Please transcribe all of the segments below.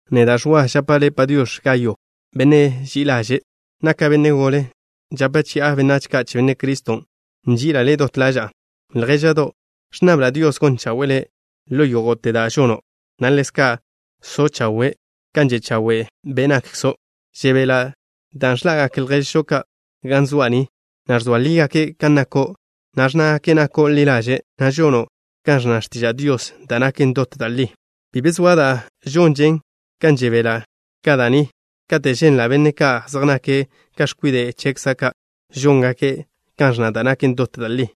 Neda', Ẕwa, žapa' le' “Padiox̱”, Gayo, benne' ži'i ḻaže'. Naka' benne' gole, žape chi'a benách ka' che Benne' Criston'. Nži'ila' le' dot ḻaža'a. Ljéža'do', ẕnnabla' Dios gon chawe'e le' ḻo yógo'te da' žono', na' ḻezka' so' chawe', kan že' chawe' be' nakkzo'. Žebela' dan' ẕḻa'gak lježžo ka' ga zoa' ni, na' ẕzoa lígake' kan nako', na' ẕnnágake' nako' ḻi ḻaže', na' žono' kan ẕnna x̱tiža' Dios, da' naken dot da' li. Bi be zoa da' žonžen ga žebela' ka da' ni, kate' ženla' benne' ka' zej nake' ka x̱kwide' chekza' ka' žóngake' kan ẕnna da' naken dot da' li.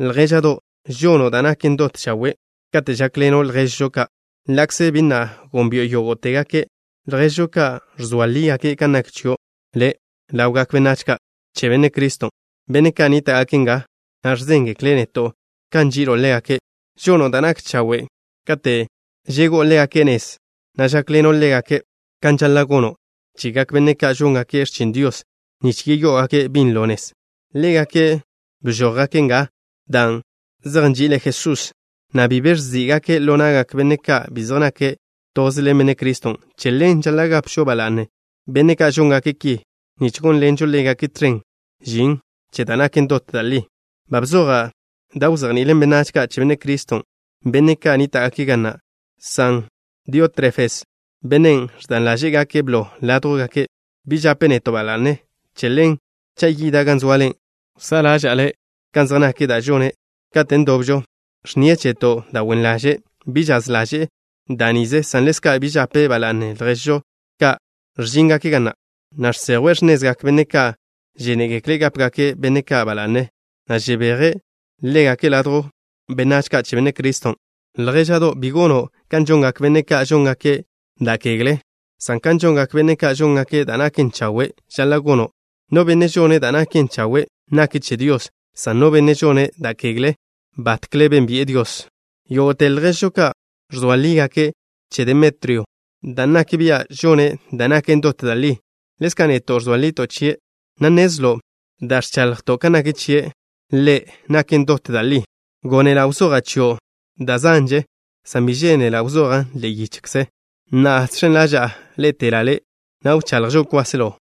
Ljéža'do', žono' da' naken dot chawe' kate' žákḻeno' lježžo ka', ḻa'kze bi na' gónbi'o yógo'tegake'. Lježžo ki ẕzoa lígake' kan nak chio' le' ḻawgak benách ka' che Benne' Criston', benne' ka' nníta'gake' nga, na' ẕzéngekle' neto' kan nži'ilo' ḻégake'. Žono' da' nak chawe' kate' žegó'o ḻégake' nez, na' žákḻeno' ḻégake' kan žaḻa' gono' chegak benne' ka' žóngake' x̱chin Dios, nich yeyó'ogake' binlo nez. Ḻégake' bžójgake' nga dan' zej nži'ile' Jesús, na' bi be ẕzí'gake' ḻo na'gak benne' ka' bi zej nake' toze ḻen Benne' Criston'. Che ḻen žaḻa' gapžo ba la'ne benne' ka' žóngake' ki, nich gónḻenžo ḻégake' tẕen žin che da' naken dot da' li. Ba bzoja' da' wzejni'ilen benách ka' che Benne' Criston', benne' ka' nníta'gake' ga na', san Diótrefes, bennen' ẕdan ḻaže'e gake' blo ládjwgake', bi žape' neto' ba la'ne. Che ḻen, cha' yida' gan zoale, wsá'a ḻáže'le kan zej nak da' žone' ḻe' katen' dobžo. Ẕnnie' cheto' da' wen ḻaže'. Bi žaz ḻaže'e da' nize, san ḻezka' bi žape' ba la'ne lježžo ka' ẕžíngake' ga na', na' žsejwe' x̱nezgak benne' ka' žénegekle' gápegake' benne' ka' ba la'ne, na' žebeje' ḻégake' ladjw benách ka' che Benne' Criston'. Ljéža'do', bi gono' kan žongak benne' ka' žóngake' da' kegle, san kan žongak benne' ka' žóngake' da' naken chawe' žaḻa' gono'. No benne' žone' da' naken chawe' nake' che Dios, san no benne' žone' da' kegle batkle bénbi'e Dios. Yógo'te lježžo ka' ẕzoa lígake' che Demetrio, dan' nak bia' žone' da' naken dot da' li. Ḻezka' neto' ẕzoa lito' chie', na' nnezlo' da' ẕchaḻjto' kan nak chie' ḻe' naken dot da' li. Gónela' wzoja' chio' da' zanže, san bi žénela' wzojan' ḻe'e yichze. Na'a, žx̱en ḻaža'a ḻé'etela' le', na' wchaḻjžo kwáselo.